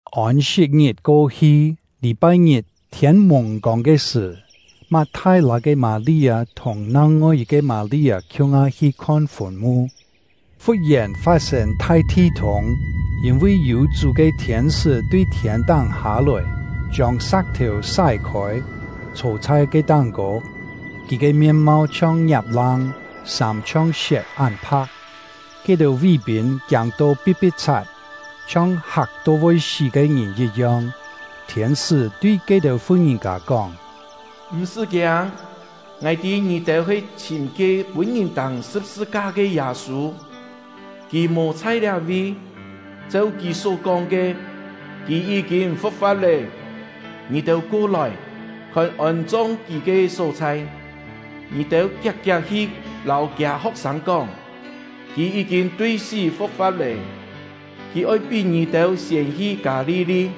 Ôn-sit-ngit ko-hi, lî-pai-ngit thiên-mùng-kông ke sṳ̀, Mat-thai-lâ ke Mâ-li-â thùng nang-ngoi yit-ke Mâ-li-â khiung-ha hi khon fùn-mu. Fut-yèn, fat-sên thai thi-thûng, yîn-vi yû Chú ke thiên-sṳ́ tui thiên-táng hâ-lòi, chiông sa̍k-thèu sái-khôi, chhô chhai ke táng-kô. Kì ke mien-mau chhiong ngiap-lang, sâm chhiong siet án pha̍k. Ke-têu ví-pîn kiâng-to pi̍t-pi̍t-chhat, chhiong hak-to voi sí ke ngìn yit-yong. Thiên-sṳ́ tui ke-têu fu-ngìn-kâ kóng: “M̀-sṳ́ kiâng; ngài tî ngì-têu he chhìm ke pûn-ngìn tâng sṳ̍p-sṳ-ka ke Yâ-sû. Kì mò chhai liá-vi, cheu kì só-kóng ke, kì yí-kîn fu̍k-fa̍t lé. Ngì-têu ko-lòi, khon ôn-chong kì ke só-chhai. Ngì-têu kiak-kiak hi lâu kiâ ho̍k-sâng kóng: ‘Kì yí-kîn tui sí fu̍k-fa̍t lé; kì oi pí ngì-têu siên hi Kâ-li-li;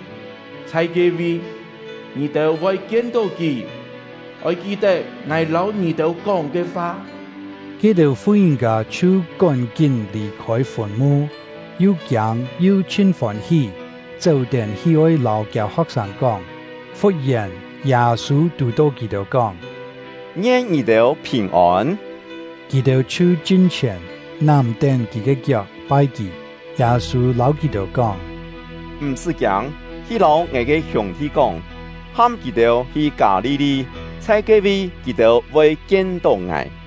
chhai ke-vi, ngì-têu voi kien-tó kì.’ Oi ki-tet ngài lâu ngì-têu kóng ke fa.” Ke-têu fu-ngìn-kâ chhiu kón-kín lì-khôi fùn-mu, yu kiâng yu chhin fôn-hí, chéu-tén hi oi lâu kiâ ho̍k-sâng kóng. Fut-yèn, Yâ-sû tù-tó kì-têu, kóng: “Ngien ngì-têu phìn-ôn!” Kì-têu chhiu chin-chhièn, nám-tén kì ke kiok, pai kì. Yâ-sû lâu kì-têu kóng: “M̀-sṳ́ kiâng; hi lâu ngài ke hiûng-thi kóng, ham kì-têu hi Kâ-li-li; chhai ke-vi, kì-têu voi kien-tó ngài.”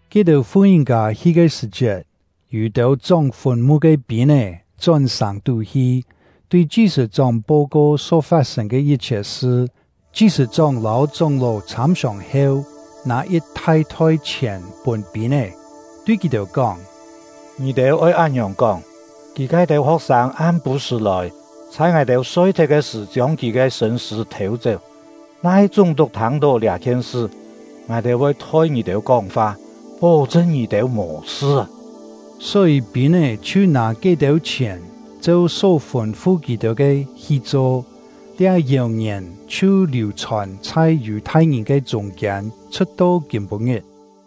Ke-têu fu-ngìn-kâ hi ke sṳ̀-chiet, yû-têu chóng fùn-mu ke pîn-é chón sàng-tú hi, tui chi-sṳ̂-chóng po-ko só fat-sên ke yit-chhiet sṳ. Chi-sṳ̂-chóng lâu chóng-ló chhâm-siòng heu, nâ yit thai-thoi-chhièn pûn pîn-é, tui kì-têu kóng: “Ngì-têu oi án-ngiòng kóng: ‘Kì ke-têu ho̍k-sâng am-pû-sṳ̀ lòi, chhai ngài-têu soi-thet ke sṳ̀ chiông kì ke sṳ̂n-sṳ̂ thêu-chéu.’ Na-he chúng-tuk thâng-tó liá-khien sṳ, ngài-têu voi thoi ngì-têu kóng-fa, pó-chṳn ngì-têu mò sṳ.” Só-yî, pîn-é chhiu nâ ke-têu chhièn, cheu só fûn-fu kì-têu ke hi cho. Liá yèu-ngièn chhiu liù-chhòn chhai Yù-thai-ngìn ke chûng-kiên, chhṳ̍t-to kîm-pû-ngit.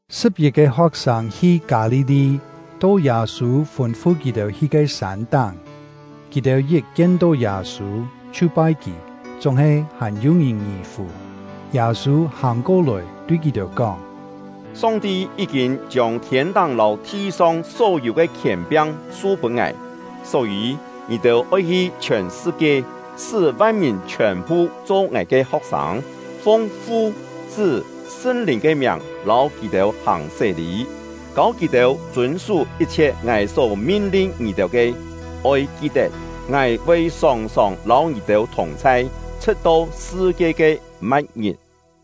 Sṳ̍p-yit-ke ho̍k-sâng hi Kâ-li-li, to Yâ-sû fûn-fu kì-têu hi ke sân-táng. Kì-têu yit kien-tó Yâ-sû, chhiu pai kì; chúng-he hàn yû-ngìn ngì-fù. Yâ-sû hàng ko-lòi, tui kì-têu kóng: “Song-ti yí-kîn chiông thiên-táng lâu thi-song só-yû ke khièn-piang su-pûn ngài. Só-yî, ngì-têu oi hi chhiòn sṳ-kie, sṳ́ van-mìn chhiòn-phu cho ngài ke ho̍k-sâng, fung Fu, Chṳ́, Sṳn-Lìn ke miàng lâu kì-têu hàng sé-lî, kâu kì-têu chûn-sú yit-chhiet ngài só min-lin ngì-têu ke. Oi ki-tet! Ngài voi sòng-sòng lâu ngì-têu thùng-chhai, chhṳ̍t-to sṳ-kie ke ma̍t-ngit.”